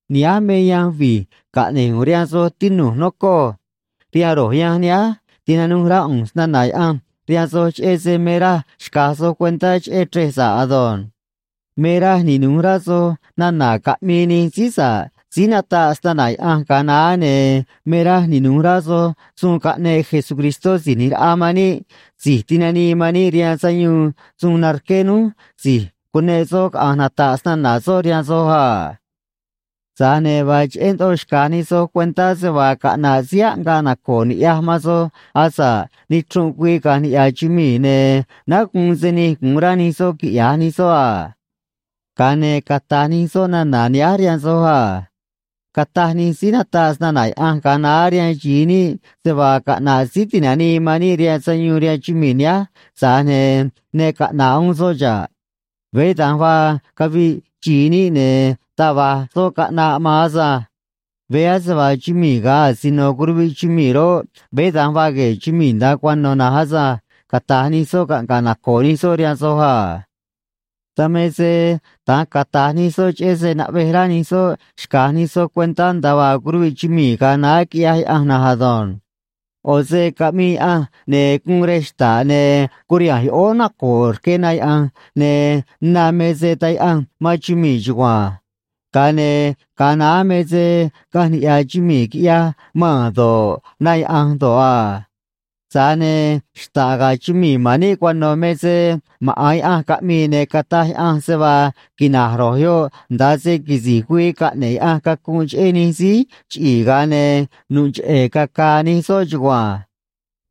Nihánj me yanj vi̱j caꞌne̱j ꞌu̱nj rihaan soj, tinu̱j, nocoj. Rihaan ro̱j yanj nihánj tinanuj rá ꞌu̱nj snana̱ Yaꞌanj rihaan soj cheꞌé se me raj xca̱j soj cuentá cheꞌé chrej sa̱ꞌ ado̱nj. Me raj ninu̱j rá soj nana̱ caꞌmii nij síí sa̱ꞌ síí nataꞌ snana̱ Yaꞌanj ga̱a naá, ne̱ me raj ninu̱j rá soj suun caꞌneꞌ Jesucristó Si̱j ꞌNi̱j Raꞌa man níꞌ, Si̱j Tinanii man níꞌ rihaan Sayuun, suun narqué núj si̱j cuneꞌ soꞌ caꞌa̱nj nata̱ꞌ snana̱ soꞌ rihaan soj a. Tza̱j ne̱ vaa cheꞌé ndoꞌo xca̱j nij soj cuentá se vaa caꞌna̱ꞌ síí aꞌngaꞌ naco̱o̱ ni̱ꞌyaj man soj asa̱ꞌ nichrunꞌ güii caꞌa̱nj niꞌya̱ chumii̱, ne̱ náá guun se nij gu̱un rá nij soꞌ quiꞌya̱j nij soꞌ a. Ga̱a ne̱ cata̱j nij soꞌ nana̱ nihánj rihaan soj a: “Cataj nij síí nataꞌ snana̱ Yaꞌanj ga̱a naá rihaan xi̱i níꞌ se vaa caꞌna̱ꞌ Síí Ti̱nanii man níꞌ rihaan Sayuun rihaan chumii̱ nihánj, tza̱j ne̱ ne caꞌna̱ꞌ uún soꞌ xa̱ꞌ. Veé da̱nj vaa caviꞌ xi̱i níꞌ, ne̱ taj va̱j soꞌ caꞌna̱ꞌ maan asânj. Veé ase vaa chumii̱ ga̱ asino curuviꞌ chumii̱ roꞌ, veé da̱nj vaa gue̱e̱ chumii̱ nda̱a cuano̱ na̱nj asânj”, cata̱j nij soꞌ caꞌnga̱ꞌ naco̱o̱ nij soꞌ rihaan soj a. Dan me se da̱nj cata̱j nij soꞌ cheꞌé se naꞌvej rá nij soꞌ xca̱j nij soꞌ cuentá nda̱a vaa curuviꞌ chumii̱ ga̱a naá quiꞌyaj Yaꞌanj na̱nj ado̱nj. ꞌO̱ se caꞌmii Yaꞌanj, ne̱ guun rej xta̱ꞌ, ne̱ curiha̱nj yoꞌóó naco̱o̱ rque na yaꞌa̱nj, ne̱ na me se taj yaꞌanj man chumii̱ chugua̱nj. Ga̱a ne̱ ga̱a naá me se caꞌanj niꞌya̱ chumii̱, quiꞌyaj maa̱n do̱ꞌ, na yaꞌa̱nj do̱ꞌ a. Tza̱j ne̱ xta̱ꞌ ga̱ chumii̱ ma̱n níꞌ cuano̱ me se maꞌa̱n Yaꞌanj caꞌmii, ne̱ cataj Yaꞌanj se vaa quina̱j ro̱j yoꞌ nda̱a se quisi̱j güii caꞌne̱ꞌ Yaꞌanj cacunꞌ cheꞌé nij síí chiꞌi̱i̱, ga̱a ne̱ nu̱ꞌ cheꞌe̱ caca̱a̱ nij soꞌ chugua̱nj.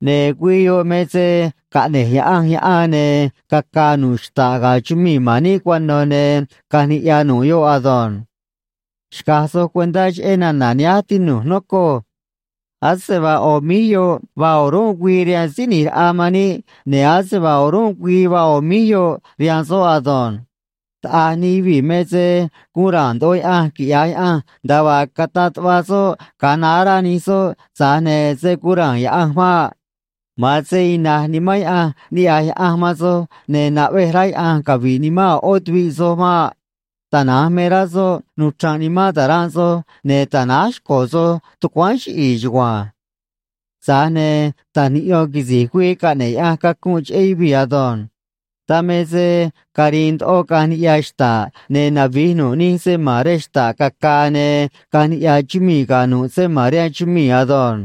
Ne̱ güii yoꞌ me se caꞌne̱j Yaꞌanj yaꞌan, ne̱ caca̱a̱ nu̱ꞌ xta̱ꞌ ga̱ chumii̱ ma̱n níꞌ cuano̱, ne̱ caꞌa̱nj niꞌya̱ nu̱ꞌ yoꞌ ado̱nj. Xca̱j soj cuentá cheꞌé nana̱ nihánj, tinu̱j, nocoj. Ase vaa ꞌo̱ míj yoꞌ vaa o̱rúnꞌ güii rihaan Síí ꞌNi̱j Raꞌa man níꞌ, ne̱ ase vaa o̱rúnꞌ güii vaa ꞌo̱ míj yoꞌ rihaan soꞌ ado̱nj. Taꞌa̱j nij yuvii̱ me se gu̱un ra̱a̱n ndoꞌo Yaꞌanj quiꞌya̱j Yaꞌanj nda̱a vaa cataꞌ tuꞌva soꞌ ga̱a naá, rá nij soꞌ, tza̱j ne̱ se̱ guun ra̱a̱n Yaꞌanj maꞌ. Ma̱an se ina̱j nimán Yaꞌanj niꞌya̱j Yaꞌanj man soj, ne̱ naꞌvej rá Yaꞌanj cavi̱ꞌ nimán a̱ ꞌó tuviꞌ soj maꞌ. Tana̱nj me rá soꞌ nuchra̱nꞌ nimán ta̱ranꞌ soj ne̱ ta̱náj xco̱ soj tucuáán chiꞌi̱i̱ chugua̱nj. Tza̱j ne̱ ta̱j niꞌyo̱n quisi̱j güii caꞌne̱ꞌ Yaꞌanj cacunꞌ cheꞌé yuvii̱ ado̱nj. Dan me se ca̱ri̱i̱n ndoꞌo caꞌa̱nj niꞌya̱ xta̱ꞌ, ne̱ navi̱j nu̱ꞌ nij se ma̱n rej xta̱ꞌ caca̱a̱, ne̱ caꞌa̱nj niꞌya̱ chumii̱ ga̱ nu̱ꞌ se ma̱n rihaan chumii̱ ado̱nj.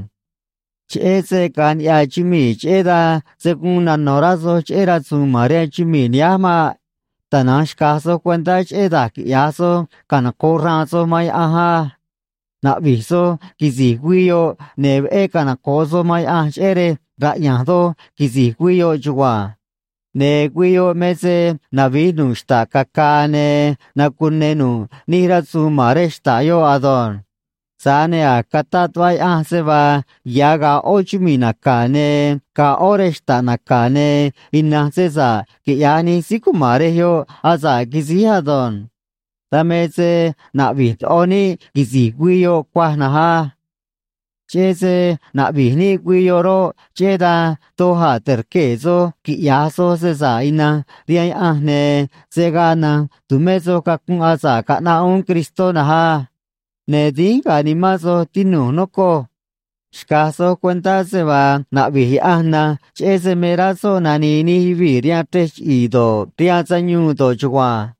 Cheꞌé se caꞌa̱nj niꞌya̱ chumii̱, cheꞌé dan se̱ guun nano̱ rá soj cheꞌé rasu̱u̱n ma̱n rihaan chumii̱ nihánj maꞌ. Tana̱nj xca̱j soj cuentá cheꞌé da̱j quiꞌya̱j soj canoco̱ꞌ xraan soj man Yaꞌanj á. Na̱ꞌvi̱j soj quisi̱j güii yoꞌ, ne̱ veꞌé canoco̱ꞌ soj man Yaꞌanj cheꞌé rej raꞌya̱nj doj quisi̱j güii yoꞌ chugua̱nj. Ne̱ güii yoꞌ me se navi̱j nu̱ꞌ xta̱ꞌ caca̱a̱, ne̱ nacune̱ nu̱ꞌ nij rasu̱u̱n ma̱n rej xta̱ꞌ yoꞌ ado̱nj. Tza̱j ne̱ a̱j cataꞌ tuꞌva Yaꞌanj se vaa ya̱ ga̱a̱ ꞌó chumii̱ naca̱, ne̱ ga̱a̱ ꞌó rej xta̱ꞌ naca̱, ne̱ ina̱nj se sa̱ꞌ quiꞌya̱j nij síí cuma̱n rej yoꞌ asa̱ꞌ quisíj ado̱nj. Dan me se naꞌvi̱j ndoꞌo níꞌ quisi̱j güii yoꞌ cuaj na̱nj á. Cheꞌé se naꞌvi̱j níꞌ güii yoꞌ roꞌ, cheꞌé dan doj a̱ te̱rquee̱ soj quiꞌya̱j soj se sa̱ꞌ ina̱nj rihaan Yaꞌanj, ne̱ se̱ gaa na̱nj tu̱mé soj cacunꞌ asa̱ꞌ caꞌnaꞌ uún Cristó na̱nj á. Ne̱ dínj ga̱a̱ nimán soj, tinu̱j, nocoj. Xca̱j soj cuentá se vaa naꞌvi̱j Yaꞌanj na̱nj cheꞌé se me rá soꞌ nani̱i̱ nij yuvii̱ rihaan chrej chiꞌi̱i̱ do̱ꞌ, rihaan sayuun do̱ꞌ chugua̱nj.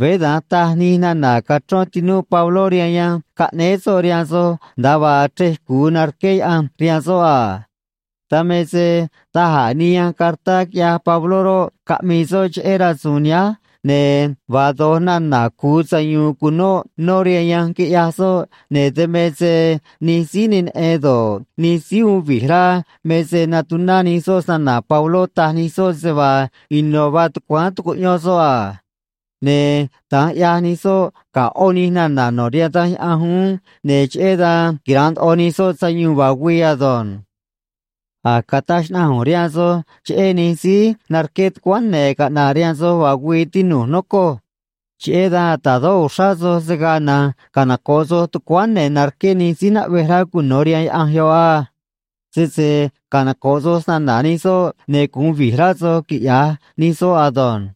Veé da̱nj taj nij nana̱ cachrón tinúꞌ Pabló rihaan yanj caꞌnéé soꞌ rihaan soj, nda̱a vaa chrej cu̱u narqué Yaꞌanj rihaan soꞌ a. Dan me se da̱j a̱ nij yanj cartá quiꞌyaj Pabló roꞌ, caꞌmii soꞌ cheꞌé rasu̱u̱n nihánj, ne̱ vaa do̱j nana̱ cu̱u sayu̱u̱n cu̱nóꞌ nó rihaan yanj quiꞌyaj soꞌ, ne̱ dan me se nij síí ne neꞌen do̱ꞌ, nij síí uun vi̱j rá me se natuná nij soꞌ snana̱ Pabló, taj nij soꞌ se vaa ino̱ vaa tucuáán tucuꞌyón soꞌ a. Ne̱ da̱nj ꞌyaj nij soꞌ ga̱ ꞌó nij nana̱ no̱ rihaan Danj Yaꞌanj uún, ne̱ cheꞌé dan quira̱nꞌ ndoꞌo nij soꞌ sayuun vaa güii ado̱nj. A̱j cataj xnaꞌanj ꞌu̱nj rihaan soj cheꞌé nij síí narqué tucuáán ne̱ caꞌna̱ꞌ rihaan soj vaa güii, tinu̱j, nocoj. Cheꞌé dan ta̱dó uxrá soj se̱ gaa na̱nj canoco̱ꞌ soj tucuáán ne̱ narque̱ nij síí naꞌvej rá cuno̱ rihaan Yaꞌanj yoꞌ á. Sese canoco̱ꞌ soj snana̱ nij soꞌ, ne̱ gu̱un vi̱j rá soj, quiꞌya̱j nij soꞌ ado̱nj.